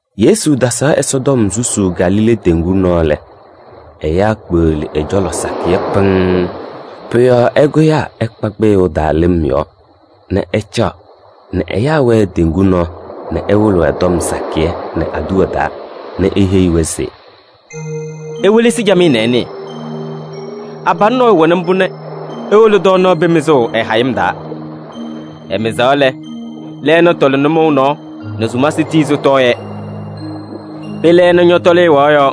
Yesu tasaɣ Ɛsɔtɔm susuu Galilee teŋgu nɔɔ lɛ, ɛyaa kpeɣli ɛ-cɔlɔ sakɩyɛ pɩŋŋ. Pʋ-yɔɔ ɛkʋyaa ɛkpa kpɩyʋʋ taa lɩm yɔɔ nɛ ɛcaɣ nɛ ɛyaa wɛɛ teŋgu nɔɔ nɛ ɛwɩlɩ-wɛ tɔm sakɩyɛ nɛ aduwa taa nɛ eheyi-wɛ se: “Iwelesi camɩyɛ nɛ ɩnɩɩ: abalʋ nɔɔyʋ wɛnɩ mbʋ nɛ ewolo tɔɔnaɣ pee mɩzʋʋ ɛ-hayɩm taa. Ɛmɩzaɣ lɛ, lɛɛna tɔlɩ nʋmɔʋ nɔɔ nɛ sumasɩ tii sɩtɔɔ-yɛ. Pee lɛɛna ñɔtɔlɩ ɛwaɣ yɔɔ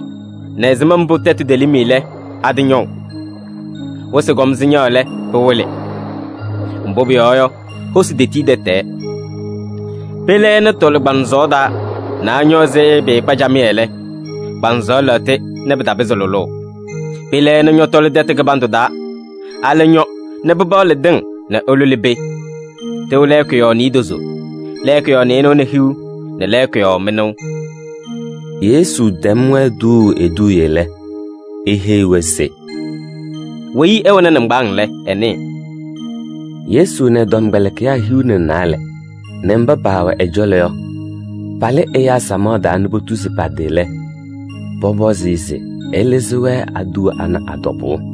nɛ ɛzɩma mbʋ tɛtʋ telim lɛ, atɩñɔʋ. Wɩsɩ kɔm sɩñaɣ lɛ, pɩwɩlɩ. Mbʋ pʋyɔɔ yɔ, hosi tetii tɛtɛɛ. Pee lɛɛna tɔlɩ kpaŋsɔɔ taa nɛ añɔ ɛzɩ pɩɩkpa camɩyɛ lɛ, kpaŋsɔɔ lɛɣtɩ nɛ pɩtapɩzɩ lʋlʋʋ. Pee lɛɛna ñɔtɔlɩ tɛtʋ kɩbandʋ taa, alɛ ñɔ nɛ pɩpaɣlɩ tɩŋ nɛ ɩlʋlɩ pee. Tɩʋ lɛɛkʋ yɔɔ niidozo, lɛɛkʋ yɔɔ nɩɩnʋwa nɛ hiu nɛ lɛɛkʋ yɔɔ mɩnʋʋ.” Yesu tɛm-wɛ tuuu eduuye lɛ, eheyi-wɛ se: “Weyi ɛwɛnɩ nɩŋgbaaŋ lɛ, ɛnɩɩ.” Yesu nɛ ɛ-tɔmkpɛlɩkɩyaa hiu nɛ naalɛ nɛ mba paawɛ ɛ-cɔlɔ yɔ, palɩ ɛyaa samaɣ taa nɛ potuzi pa-tɩ lɛ, pɔpɔzɩ-ɩ se ɛlɩzɩ-wɛ aduwa ana a-tɔbʋʋ.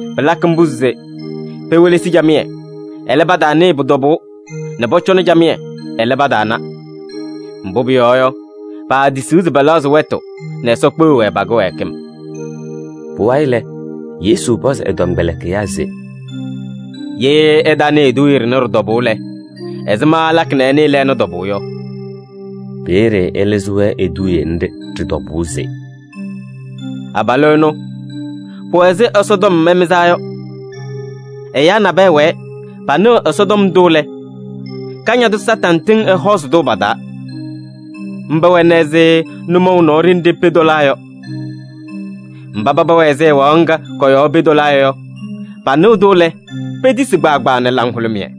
Pɩlakɩ mbʋ se: ‘Pewelesi camɩyɛ, ɛlɛ, pataanɩɩ pʋ-tɔbʋʋ nɛ pɔcɔnɩ camɩyɛ, ɛlɛ, pataana. Mbʋ pʋyɔɔ yɔ, paatisiɣ se pɛlɛɣzɩ wɛtʋ nɛ Ɛsɔ kpeɣ-wɛ pa-kɩwɛɛkɩm.’” Pʋwayɩ lɛ, Yesu pɔzɩ ɛ-tɔmkpɛlɩkɩyaa se: “Ye ɩtanɩɩ eduuye ɖɩnɛ ɖɩ-tɔbʋʋ lɛ, ɛzɩma ɩlakɩ nɛ ɩnɩɩ lɛɛna tɔbʋʋ yɔ?” Peeye ɛlɩzɩ-wɛ eduuye nɖɩ ɖɩ-tɔbʋʋ se: “Abalʋ ɛnʋ, pʋwɛ ɛzɩ Ɛsɔtɔm ɛmɩzaa yɔ. Ɛyaa nabɛyɛ wɛɛ, panɩɣ Ɛsɔtɔm ndʋ lɛ, Kañadʋ Satanɩ tɩŋ ɛhɔɔzɩ-tʋ pa-taa. Mba wɛna ɛzɩ nʋmɔʋ nɔɔ ɖenɖe pee tɔlaa yɔ. Mba paba wɛ ɛzɩ ɛwaɣ ŋga kɔ-yɔɔ pee tɔlaa yɔ, panɩɣ-tʋ lɛ, petisi kpaagbaa nɛ laŋhʋlʋmɩyɛ.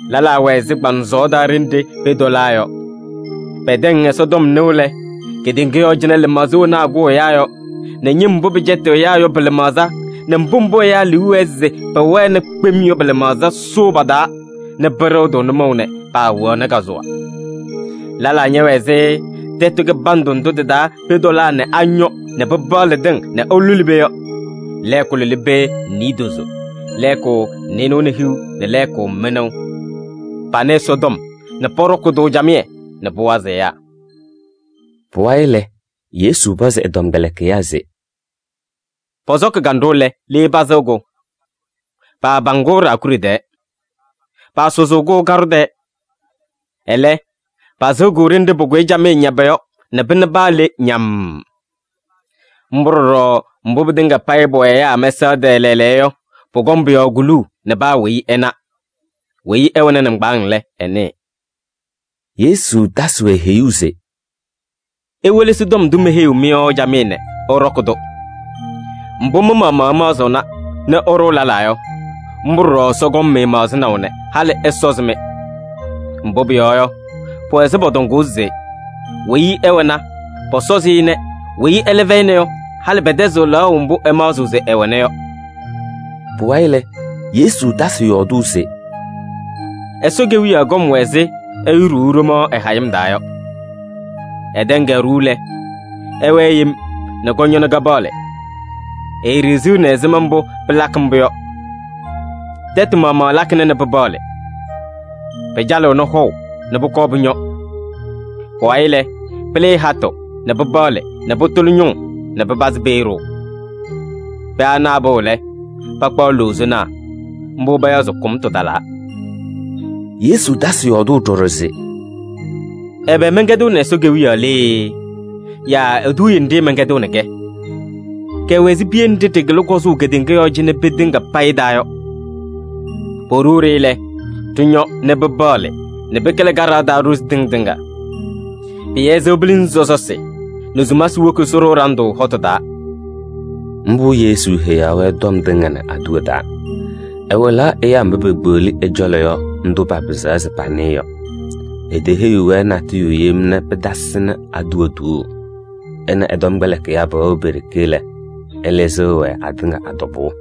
Lɛlaa wɛ ɛzɩ kpaŋsɔɔ taa ɖenɖe pee tɔlaa yɔ. Pɛtɛŋ Ɛsɔtɔm nɩʋ lɛ, kedeŋa yɔɔ cɩnɛ lɩmaɣza wena akʋʋ ɛyaa yɔ nɛ ñɩm mbʋ pɩcɛtɩɣ ɛyaa yɔ pɩ-lɩmaɣza nɛ mbʋ mbʋ ɛyaa liu wɛɛ se pɛwɛna kpem yɔ pɩ-lɩmaɣza sʋʋ pa-taa nɛ pɩɖɩɣ-tʋ nʋmɔʋ nɛ paawɛɣnɩ kazʋwa. Lɛlaa ñɛwɛ ɛzɩ tɛtʋ kɩbandʋ ndʋ tɩ-taa pee tɔlaa nɛ añɔ nɛ pɩpaɣlɩ tɩŋ nɛ ɩlʋlɩ pee yɔ: lɛɛkʋ lʋlɩ pee niidozo, lɛɛkʋ nɩɩnʋwa nɛ hiu nɛ lɛɛkʋ mɩnʋʋ. Panɩ Ɛsɔtɔm nɛ pɔɖɔkɩ-tʋ camɩyɛ nɛ pʋwazɩ ɛyaa.” Pʋwayɩ lɛ, Yesu pɔzɩ ɛ-tɔmkpɛlɩkɩyaa se: “Pɔsɔkɩ kanɖʋ lɛ, le pasɩɣ-kʋ? Paapaŋ-kʋ ɖaakuɖe tɛɛ. Paasʋzʋʋ-kʋ kaɖʋ tɛɛ. Ɛlɛ, pasɩɣ-kʋ ɖenɖe pʋkʋyɩ camɩyɛ ñaba yɔ nɛ pɩna paa le ñamm. Mbʋ ɖɔɖɔ mbʋ pɩtɩŋa payɩ pʋwɛ ɛyaa mɛsaɣ tɛɛ lɛɛlɛɛyɔ yɔ, pʋkɔŋ pʋ-yɔɔ kuluu nɛ paa weyi ɛna. Weyi ɛwɛnɩ nɩŋgbaaŋ lɛ, ɛnɩɩ.” Yesu tasɩ-wɛ heyuu se: “Iwelesi tɔm ndʋ meheyiɣ-mɩ yɔ camɩyɛ nɛ ɩɖɔkɩ-tʋ. Mbʋ mɩ-maɣmaɣ ɩmaɣzɩɣna nɛ ɩɖʋʋ lɛlaa yɔ, mbʋ ɖɔɖɔ Ɛsɔ kɔŋ-mɩ maɣzɩnaʋ nɛ halɩ ɛsɔzɩ-mɩ. Mbʋ pʋyɔɔ yɔ, pʋwɛ ɛzɩ pɔtɔŋʋʋ se: ‘Weyi ɛwɛna, pɔsɔzɩ-ɩ nɛ weyi ɛlɛ fɛyɩna yɔ, halɩ pɛtɛzɩɣ lɛɣʋ mbʋ ɛmaɣzɩɣ se ɛwɛna yɔ’ yɔ.” Pʋwayɩ lɛ, Yesu tasɩ yɔɔdʋʋ se: “Ɛsɔ Kewiyaɣ kɔm wɛ ɛzɩ ɛyʋ ɖuuu ɖomaɣ ɛ-hayɩm taa yɔ. Ɛtɛŋ-kɛ ɖuu lɛ, ɛwɛɛ yem nɛ kɔñɔ nɛ kapaɣlɩɣ. Eeɖiɣziɣni ɛzɩma mbʋ pɩlakɩ mbʋ yɔ. Tɛtʋ maɣmaɣ lakɩna nɛ pɩpaɣlɩ. Pɩcalɩɣnɩ hɔʋ nɛ pʋkɔɔ pʋñɔ. Pʋwayɩ lɛ, pɩlɩɩ hatʋ nɛ pɩpaɣlɩ nɛ pʋtʋlɩ ñʋŋ nɛ pɩpazɩ pee ɖʋʋ. Pee ana apɩɣ lɛ, pakpaɣ loozonaa. Mbʋ pʋyɔɔ yɔ, kʋmtʋ talaa.” Yesu tasɩ yɔɔdʋʋ ɖɔɖɔ se: “Ɛbɛ mɛnkɛdɩɣnɩ Ɛsɔ Kewiyaɣ lee yaa eduuye nɖɩ mɛnkɛdɩɣnɩ-kɛ? Kɛwɛ ɛzɩ piye nɖɩ ɖɩkɩlɩ kɔzʋʋ kedeŋa yɔɔ cɩnɛ pee tɩŋa payɩ taa yɔ. Poɖuu-ɖɩ lɛ, ɖɩñɔ nɛ pɩpaɣlɩ nɛ pɩkɩlɩ kaɖaɣ taa ɖozi tɩŋ tɩŋa. Pɩyɛzɩɣ pilinzi sɔsɔsɩ nɛ sumasɩ woki sɩɖʋʋ ɖandʋ hɔtʋ taa.” Mbʋ Yesu heyaɣ-wɛ tɔm tɩŋa nɛ aduwa taa. Ɛwɩlaɣ ɛyaa mba pekpeɣli ɛ-cɔlɔ yɔ ndʋ papɩzaɣ se panɩɩ yɔ. Eteheyiɣ-wɛ natʋyʋ yem nɛ pɩtasɩnɩ aduwa tuuu. Ɛ nɛ ɛ-tɔmkpɛlɩkɩyaa pɛwɛɣ pe-ɖeke lɛ, ɛlɩzɩɣ-wɛ atɩŋa a-tɔbʋʋ.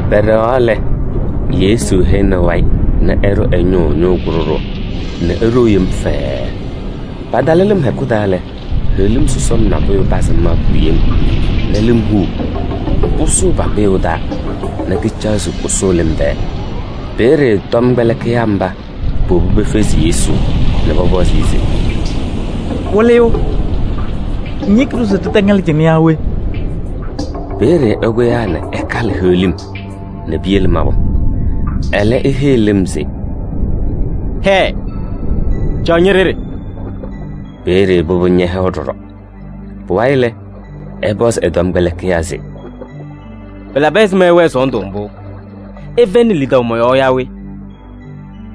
Pɛɖɛɣaɣ lɛ, Yesu hɛnɩ wayɩ nɛ ɛɖʋ ɛ-ñʋʋ ñʋʋ kʋɖʋɖʋʋ nɛ eɖou yem fɛɛɛ. Patalɩ lɩm hɛkʋ taa lɛ, heɣlim sɔsɔm nabʋyʋ pazɩ mabʋ yem nɛ lɩm huu nɛ pʋsʋʋ pa-kpɩyʋʋ taa nɛ kɩcaɣ se kʋsʋʋ lɩm tɛɛ. Peeye tɔmkpɛlɩkɩyaa mba powobi pefezi Yesu nɛ pɔpɔzɩ-ɩ se: “Wɩlɩyʋ! Ŋyeki-ɖʋ se ɖɩtɛŋɛlɩ cɩnɛ yaa we?” Peeye ɛkʋyaa nɛ ɛkalɩ heɣlim nɛ piyele mabʋ. Ɛlɛ eheyi lɩm se: “Hɛɛ! Caɣ ñe-ɖeɖe.” Peeye pʋbʋ ñɛhɛwa ɖɔɖɔ. Pʋwayɩ lɛ, ɛpɔzɩ ɛ-tɔmkpɛlɩkɩyaa se: “Pɩlabɩ ɛzɩma ɩwɛɛ sɔɔndʋ mbʋ? Ɩfɛyɩnɩ lidaʋ mɔ-yɔɔ yaa we?”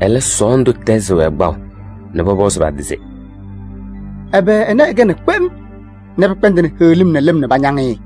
Ɛlɛ, sɔɔndʋ tɛzɩ-wɛ kpaʋ nɛ pɔpɔzʋʋ pa-tɩ se: “Ɛbɛ ɛnɛ ɛkɛnaa kpem nɛ pɩkpɛndɩnɩ heɣlim nɛ lɩm nɛ pañaŋ-ɩ?”